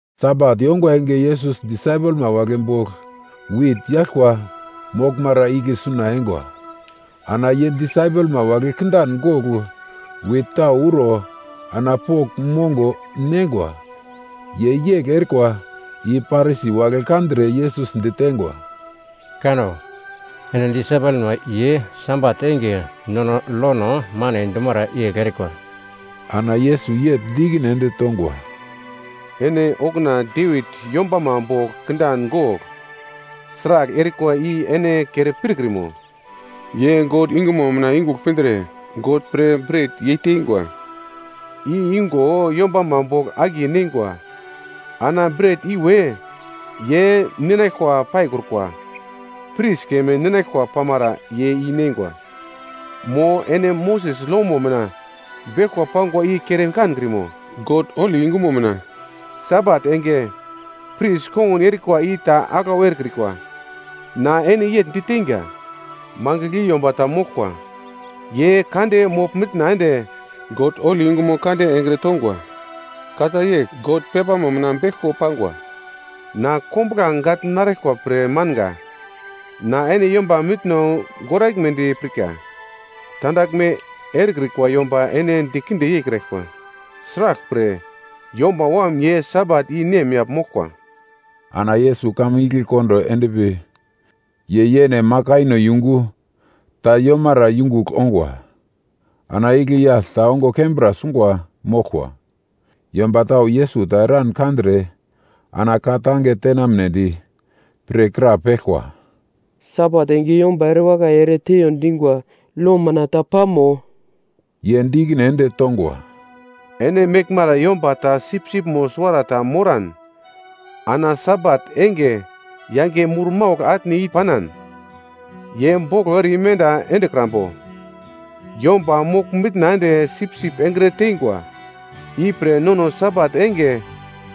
Sabat yongwa enge Yesus disaipelma wagle bogl wit yaglkwa moglmara igle suna eingwa. Ana ye disaipelma wagle kindan gogl wit tau uro ana pogl mongo neingwa. Ye yegl erikwa i Parisi wagle kandre Yesus diteingwa, “Kanno! Ene disaipelma ye Sabat enge nono lono mane dumara yegl erikwa.” Ana Yesus yegl di ikine ende tongwa, “Ene okuna Devit yombama bogl kindan gogl sragl erikwa i ene kere pirkrimo? Ye God yungumo mina yungugl pindre, God pre bret yeitengwa i igo yombama bogl akiye neingwa. Ana bret iwe ye ninaglkwa paikrukwa. Pris keme ninaglkwa pamara ye i neingwa. Mo ene Moses lomo mina beglkwa pangwa i kere kankrimo? God holi yungumo mina Sabat enge pris kongun erikwa i ta aglau erekrikwa. Na ene yegl diteinga, mangigl i yomba ta moglkwa ye kande mogl-mitna ende God holi yungumo kande engre tongwa. Ka ta yegl God pepamo mina beglko pangwa, ‘Na kombuglange gagl naraglkwa pre manga, na ene yomba mitno goraglmedi pirka.’ Tandaglme erekrikwa yomba ene dikinde yeikraglkwa. Sraglpre Yomba Wam ye Sabat i nemyagl moglkwa.” Ana Yesus kamun igle kondo endpi, ye yene makaino yungu ta yomara yungugl ongwa. Ana igle yagl ta ongo kembra sungwa moglkwa. Yomba tau Yesus ta eran kandre ana ka-tange tenamnedi pre krapeglkwa, “Sabat enge yomba erewakai ere teiyo dingwa lo mina ta pamo?” Ye di ikine ende tongwa, “Ene meglmara yomba ta sipsipmo suwarata moran, ana Sabat enge yange murmaugl atne i panan, ye boglo ere imenda endekrambo? Yomba mogl-mitna ende sipsip engre teingwa. Ipre nono Sabat enge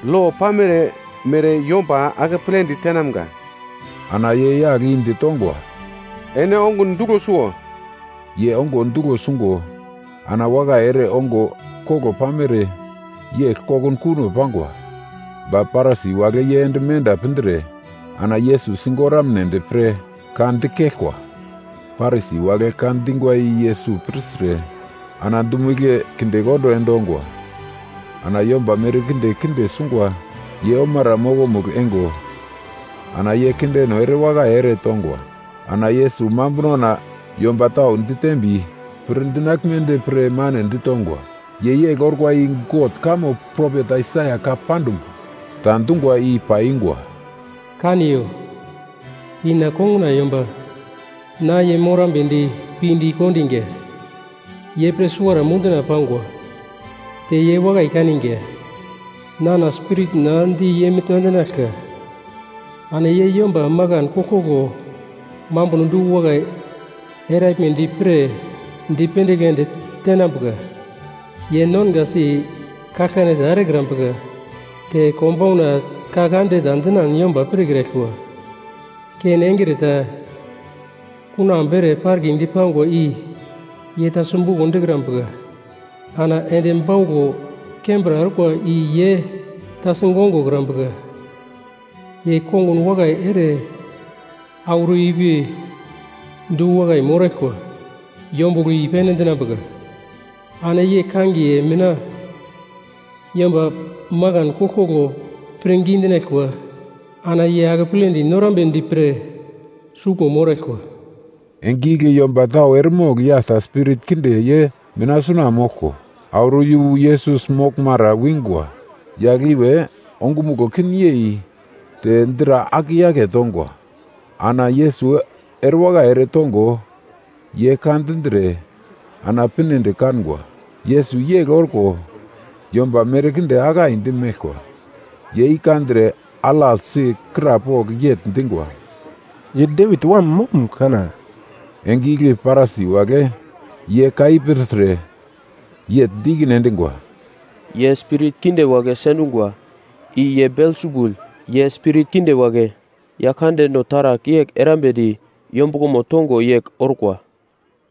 lo pamere mere yomba akepledi tenamga.” Ana ye yagl i ditongwa, “Ene ongun duglo suwo.” Ye ongo duglo sungo ana wakai ere ongo koglo pamere yegl kokunkuno pangwa. Ba Parisi wagle ye ende menda pindre ana Yesus sigoramnedi pre ka dikeglkwa. Parisi wagle ka dingwa i Yesus pirtre, ana dumo igle kindekondo endongwa. Ana yomba merkinde kinde sungwa ye omara mokomugl eingo, ana ye kindeno erewakai ere tongwa. Ana Yesus mambunona yomba tau ditembi pir dinaglmedi pre mane ditongwa. Ye yegl orkwa i God kamo propet Aisaia ka pandum ta dungwa i paiyungwa: “Kaniyo, i na konguna yomba, na ye morambedi pinde i kondiga. Ye pre suwara munduna pangwa, te ye wakai kaninga. Nana Spiritna di ye mina endinaglka, ana ye yomba makan koglkoglo mambuno du-wakai eraglmedi pre, dipendigl ende tenambuka. Ye nongasi kaglkane ta erekrambuka, te konbauna ka kande ta dinan yomba pirkraglkwa. Ken engre ta kunambu ere parkidi pangwa i ye ta simbuko dikrambuka, ana endi bauglo kembra orkwa i ye ta sigongokrambuka. Ye kongun wakai ere auro ipi du-wakai moraglkwa, yombuglo i-pene endinambuka. Ana ye kangiye mina yomba makan koglkoglo pirngi dinaglkwa ana ye akepledi norambedi pre suglmo moraglkwa.” Enge igle yomba tau eremogl yagl ta spirit kinde ye mina suna moglko, auro yu Yesus moglmara wingwa. Yagl iwe ongumuglo kin yei te dra aketongwa. Ana Yesus erewakai ere tongo, ye ka dindre ana pinedi kangwa. Yesus yegl orko yomba merkinde akaindi meglkwa, ye i kandre alaglsi krapogl yegl dingwa, “Ye Devit wam moglum kana?” Enge igle Parisi wagle ye ka i pirtre, yegl di ikine endingwa, “Ye spirit kinde wagle sendungwa, i ye Belsebul ye spirit kinde wagle yaglkandeno taragl yegl erambedi yombuglomo tongo yegl orkwa.”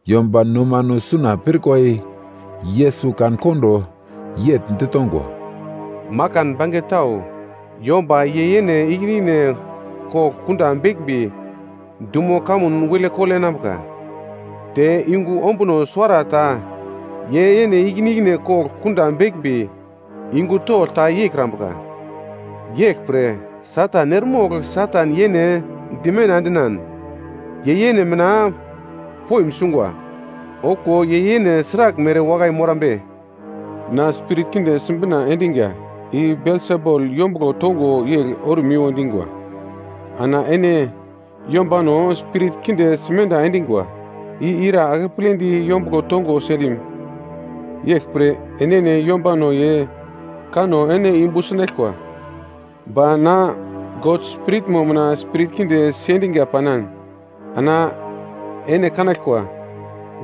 Yomba nomano suna pirkwa i Yesus kan-kondo yegl ditongwa, “Makan bange tau yomba ye yene ikine ikine kogl kunda beglmbi dumo kamun wilekole enambuka. Te yungu ombuno suwarata ye yene ikine ikine kogl kunda beglmbi yungu togl ta yeikrambuka. Yeglpre Satan eremogl Satan yene dimenda endinan, ye yene mina poim sungwa; okuwo ye yene sragl mere wakai morambe? Na spirit kinde sibina endinga i Belsebul yombuglo tongo yegl ormiwo dingwa, ana ene yombano spirit kinde simenda endingwa, i ira akepledi yombuglo tongo sendim? Yeglpre, enene yombano ye kanno ene yumbu sinaglkwa. Ba na God Spiritmo mina spirit kinde sendiga panan ana ene kanaglkwa,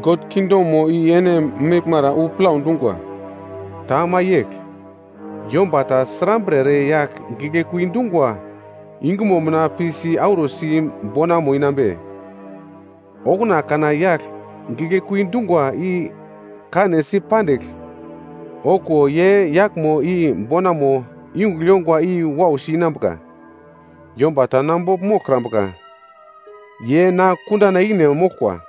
God kingdomo i ene meglmara wu plau dungwa. “Ta ama yegl, yomba ta srambre ere yagl giglekui dungwa yungumo mina pi si-arusi bonamo inambe? Okuna kana yagl giglekui dungwa i kanesi pandigl, okuwo ye yaglmo i bonamo yungugl yongwa i wausi inambuka. “Yomba ta na bogl moglkrambuka, ye na kundana ikine moglkwa,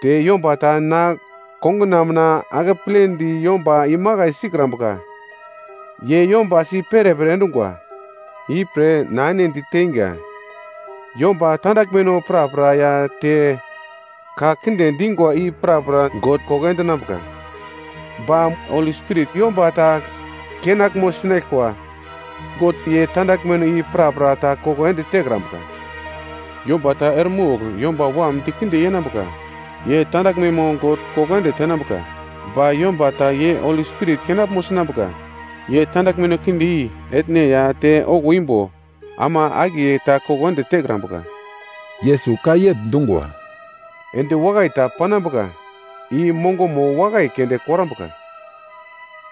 te yomba ta na konguna mina akepledi yomba imakai sikrambuka, ye yomba si perepere endungwa. Ipre na ene diteinga, yomba tandaglmeno prapra ya te ka kinde dingwa i prapra God koko endinambuka. Ba Holi Spirit yomba ta kenaglmo sinaglkwa, God ye tandaglmeno i prapra ta koko ende tekrambuka. Yomba ta eremogl Yomba Wam dikinde yenambuka, ye tandaglmemo God koko ende tenambuka. Ba yomba ta ye Holi Spirit kenaglmo sinambuka, ye tandaglmeno kinde i etne ya te okuwo imbo, ama akiye ta koko ende tekrambuka.” Yesus ka yegl dungwa, “Endi wakai ta panambuka i mongomo wakai keunde korambuka.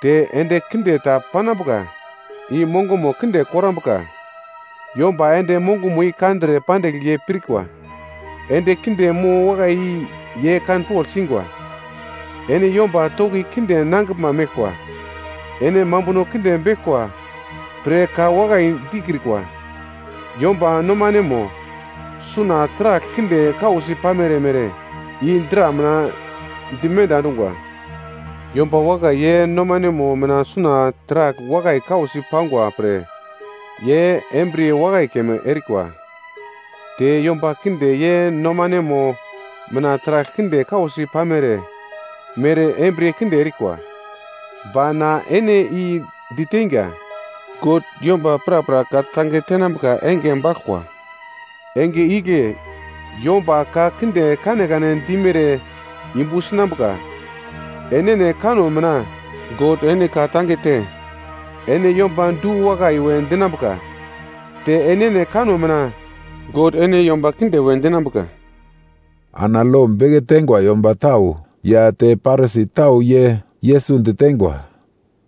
Te endi kinde ta panambuka i mongomo kinde korambuka. Yomba ende mongomo i kandre pandigl ye pirkwa, endi kinde mo wakai i ye kanpogl singwa. Ene yomba toki kinde nangiglma meglkwa, ene mambuno kinde beglkwa pre ka wakai dikrikwa. Yomba nomanemo suna taragl kinde kausi pamere mere, i dra mina dimenda endungwa. Yomba wakai ye nomanemo mina suna taragl wakai kausi pangwa pre ye embriye wakai keme erikwa. Te yomba kinde ye nomanemo mina taragl kinde kausi pamere mere embriye kinde erikwa. Ba na ene i diteinga, God yomba prapra ka-tange tenambuka enge baglkwa, enge igle yomba ka kinde kanekane dimere yumbu sinambuka. Enene kanno mina, God ene ka-tange te, ene yomba du-wakai we dinambuka. Te enene kanno mina, God ene yomba kinde we dinambuka.” Ana lo beke teingwa yomba tau ya te Parisi tau ye Yesus diteingwa,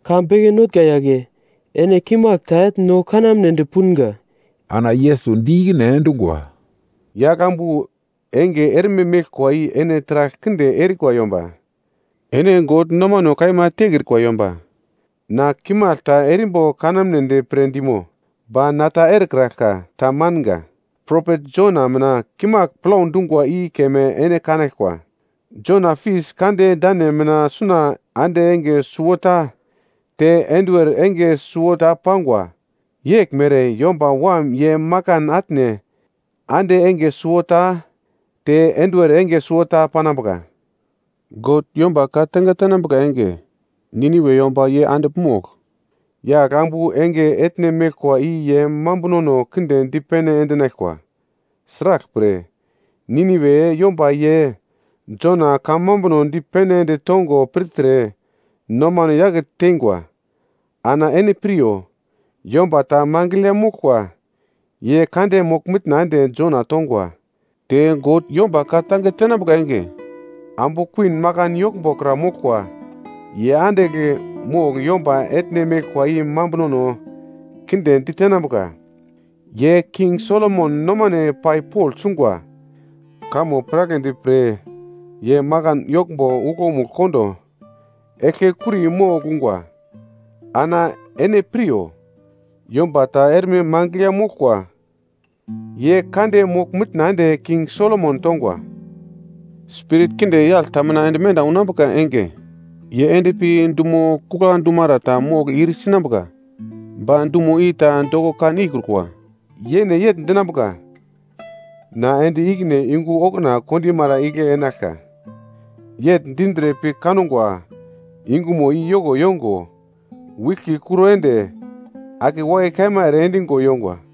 “Ka beke notnga yagle, ene kimagl ta etn no kanamnedi punga.” Ana Yesus di ikine endungwa, “Yagl ambu enge erme meglkwa i ene taragl kinde erikwa yomba, ene God nomano kaima tekrikwa yomba. Na kimagl ta erimbo kanamnedi pre dimo? Ba na ta erekraglka. Tamanga. Propet Jona mina kimagl plau dungwa i keme ene kanaglkwa. Jona fis kande dane mina suna ande enge suwota, te enduwer enge suwota pangwa. Yegl mere Yomba Wam ye makan atne ande enge suwota, te enduwer enge suwota panambuka. God yomba ka-tange tenambuka enge, Niniwe yomba ye andigl mogl yagl ambu enge etne meglkwa i ye mambunono kinde dipene ende enaglkwa. Sraglpre, Niniwe yomba ye Jona kamambuno dipene ende tongo pirtre, nomano yake teingwa. Ana ene piryo. Yomba ta mangigl ya moglkwa, ye kande mogl-mitna ende Jona tongwa. Te God yomba ka-tange tenambuka enge, Ambu Kuwin Makan Yoglmbo kra moglkwa ye andigl mogl yomba etne meglkwa i mambunono kinde ditenambuka. Ye King Solomon nomane pai pogl sungwa kamo piragledi pre ye makan yoglmbo uglomugl kondo eglke kuri mogl ungwa. Ana ene piryo. Yomba ta erme mangigl ya moglkwa, ye kande mogl-mitna ende King Solomon tongwa. “Spirit kinde yagl ta mina ende menda unambuka enge, ye endpi dumo kugla dumara ta mogl ir sinambuka ba dumo i ta doko kan ikrukwa. Yene yegl dinambuka, ‘Na ende ikine yungu okuna kondimara igle enaglka.’ Yegl dindre pi kangwa yunguna i yoko yongo, wiglki kuro ende ake wakai kaima ere endigo yongwa.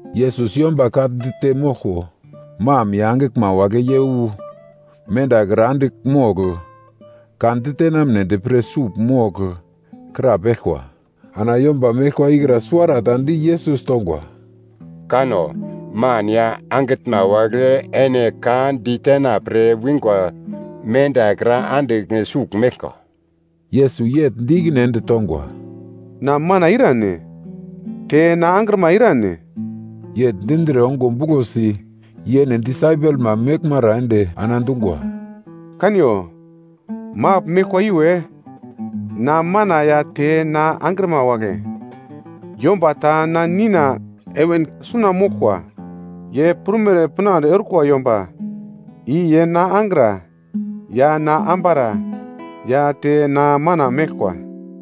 Yesus yomba ka dite moglko, mam ya angiglma wagle ye wu mendakra andigl mogl, ka ditenamnedi pre sugl mogl krapeglkwa. Ana yomba meglkwa ikra suwarata di Yesus tongwa, “Kanno! Man ya angitnma wagle ene ka ditena pre wingwa mendakra andigl sugl meglkwa.” Yesus yegl di ikine ende tongwa, “Na mana irane? Te na angrima irane?” Yegl dindre ongo buglosi yene disaipelma meglmara ende ana dungwa, “Kaniyo, magl meglkwa iwe, na mana ya te na angrima wagle. Yomba ta na Nina heven suna moglkwa, ye prumere pinande orkwa yomba i ye na angra ya na ambara ya te na mana meglkwa.”